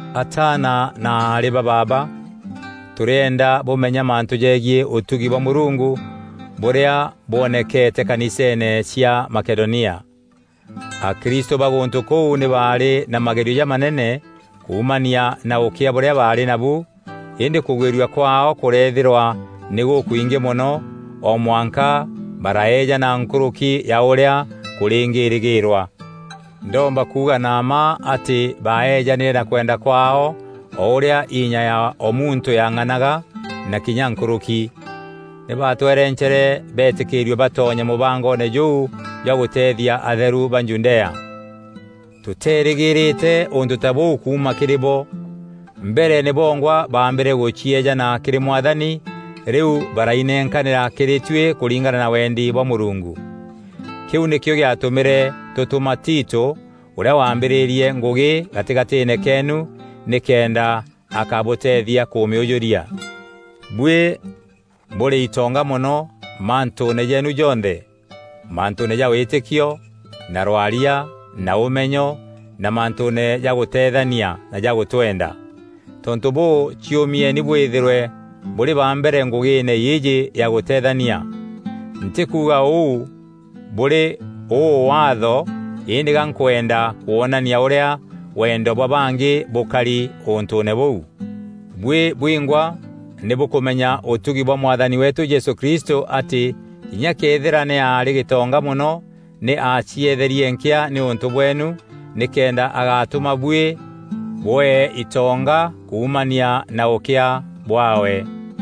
Ataana na aarî ba baaba, tûrîenda bûmenya mantû jeegiî ûtugi bwa Mûrungu bûrîa bwonekete kaniseene cia Makedonia. Akristû ba gûntû kûu nî baarî na magerio jamanene kuumania na ûkîa bûrîa baarî nabu îndî kûgwîrua kwaao kûreethîrwa nî gûkwingî mono, o mwanka baraeejana nkûrûki ya ûrîa kûrîngîrîgîîrwa. Ndomba kuuga na mma atî baeejanîre na kwenda kwaao o ûrîa inya ya o muntû yang'anaga na kinya nkûrûki. Nî baatwerencere beetîkîîrue batonye mûbangoone jûu jwa gûteethia atheru ba Judea. Tûteerîgîîrîte ûntû ta bûu kuuma kîrî bo! Mbere nî bongwa baambîre gûcieejana kîrî Mwathani rîu barainenkanîra kîrî tuî kûringana na wendi bwa Mûrungu. Kîu nîkîo gîatûmîre tûtûma Tito ûrîa waambîrîîrie ngûgî gatîgatîîne keenu nîkenda akabûteethia kûmîûjûria. Buî bûrî itonga mono mantûûne jeenu jonthe; mantûûne ja wîtîkio na rwaria na ûmenyo na mantûûne ja gûteethania na ja gûtwenda. Tontû bûû ciûmieni bwîthîrwe bûrî ba mbere ngûgîîne îîjî ya gûteethania. Ntîkuuga ûu bûrî ûû waatho îndî gankwenda kwonania ûrîa wendo bwa bangî bûkari ûntûûne bûu. Buî bwingwa nî bûkûmenya ûtugi bwa Mwathani weetû Jesû Kristû atî kinya këethîra nî aarî gîtonga mono, nî aacieetherie nkîa nîûntû bweenu nîkenda agatûma buî bwee itonga kuumania na ûkîa bwaawe.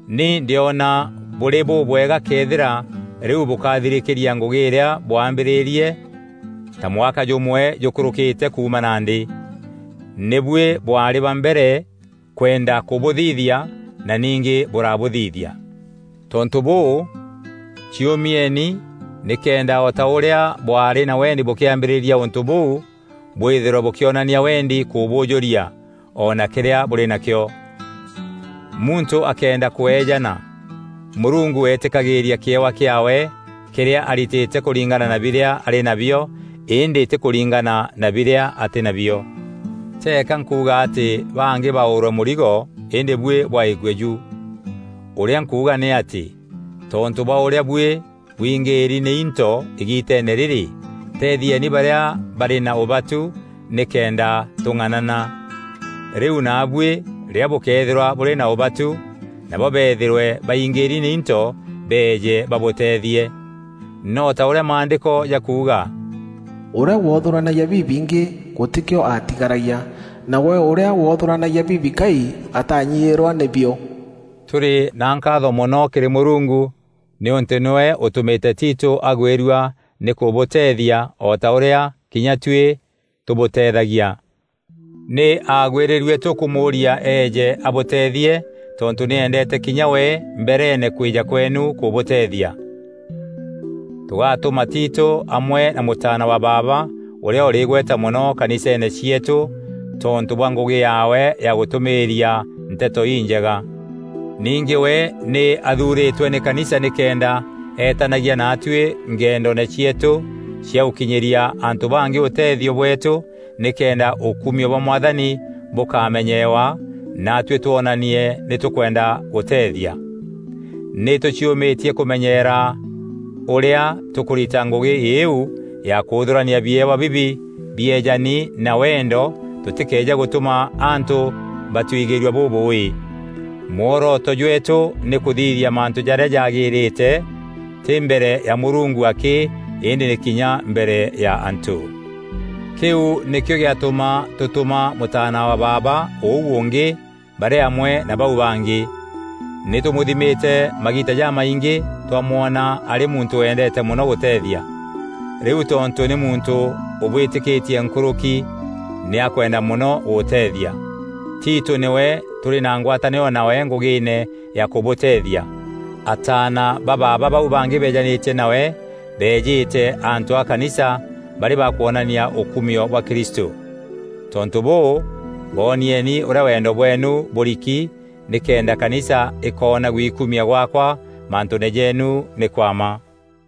Ni ndîona bûrî bûbwega këethîra rîu bûkathirîkîria ngûgî îrîa bwaambîrîrie ta mwaka jûmwe jûkûrûkîte kuuma nandî. Nî buî bwaarî ba mbere kwenda kûbûthithia na ningî bûrabûthithia. Tontû bûû, ciûmieni nîkenda o ta ûrîa bwaarî na wendi bûkîambîrîria ûntû bûu, bwîthîrwe bûkîonania wendi kûbûûjûria o na kîrîa bûrî nakîo. Muntû akeenda kweejana, Mûrungu eetîkagîîria kîewa kîaawe kîrîa aritîte kûringana na birîa arî nabio îndî tî kûringana na birîa atî nabio. Teeka nkuuga atî bangî baûrwe mûrigo îndî buî bwaîkue ju. Ûrîa nkuuga nî atî, tontû bwa ûrîa buî bwingîîri nî into îgiiteene rîrî, teethieni barîa barî na ûbatu nîkenda tûng'anana. Rîu naabuî rîrîa bûkeethîrwa bûrî na ûbatu nabo beethîrwe baingîîri nî into beeje babûteethie. No ta ûrîa Maandîko jakuuga, “Ûrîa woothûranagia bibingî, gûtîkîo aatigaragia, nawe ûrîa woothûranagia bibikai, ataanyiîrwa nî bio.” Tûrî na nkaatho mono kîrî Mûrungu nîûntû nîwe ûtûmîte Tito agwîrua nî kûbûteethia o ta ûrîa kinya tuî tûbûteethagia. Nî aagwîrîrue tûkûmûûria eeje abûteethie tontû nî eendeete kinya we mbereene kwîja kweenu kûbûteethia. Tûgatûma Tito amwe na mûtaana wa baaba ûrîa ûrî îgweta mono kaniseene cieetû tontû bwa ngûgî yaawe ya gûtûmîîria Nteto Injega. Ningî we nî athuurîtwe nî kanisa nîkenda etanagia naatuî ngendoone cieetû cia gûkinyîria antû bangî ûteethio bweetû nîkenda ûkumio bwa Mwathani bûkamenyeewa, naatuî twonanie nî tûkwenda gûteethia. Nî tûciûmîtie kûmenyeera ûrîa tûkûrita ngûgî îîu ya kûûthûrania biewa bibi bieejani na wendo tûtîkeeje gûtûma antû batwigîîrua bûbûûî. Mworoto jweetû nî kûthithia mantû jarîa jaagîrîte, tî mbere ya Mûrungu akî îndî nî kinya mbere ya antû. Kîu nîkîo gîatûma tûtûma mûtaana wa baaba ûu ûngî barî amwe na bau bangî. Nî tûmûthimîte magiita jamaingî twamwona arî muntû wendeete mono gûteethia. Rîu tontû nî muntû ûbwîtîkîtie nkûrûki, nî akwenda mono gûteethia. Tito nîwe tûrî na ngwatanîro nawe ngûgîîne ya kûbûteethia. Ataana ba baaba bau bangî beejanîtie nawe beejîte antû a kanisa barî ba kwonania ûkumio bwa Kristû. Tontû bûû, boonieni ûrîa wendo bweenu bûriki nîkenda kanisa ikoona gwikumia gwaakwa mantûûne jeenu nî kwa mma.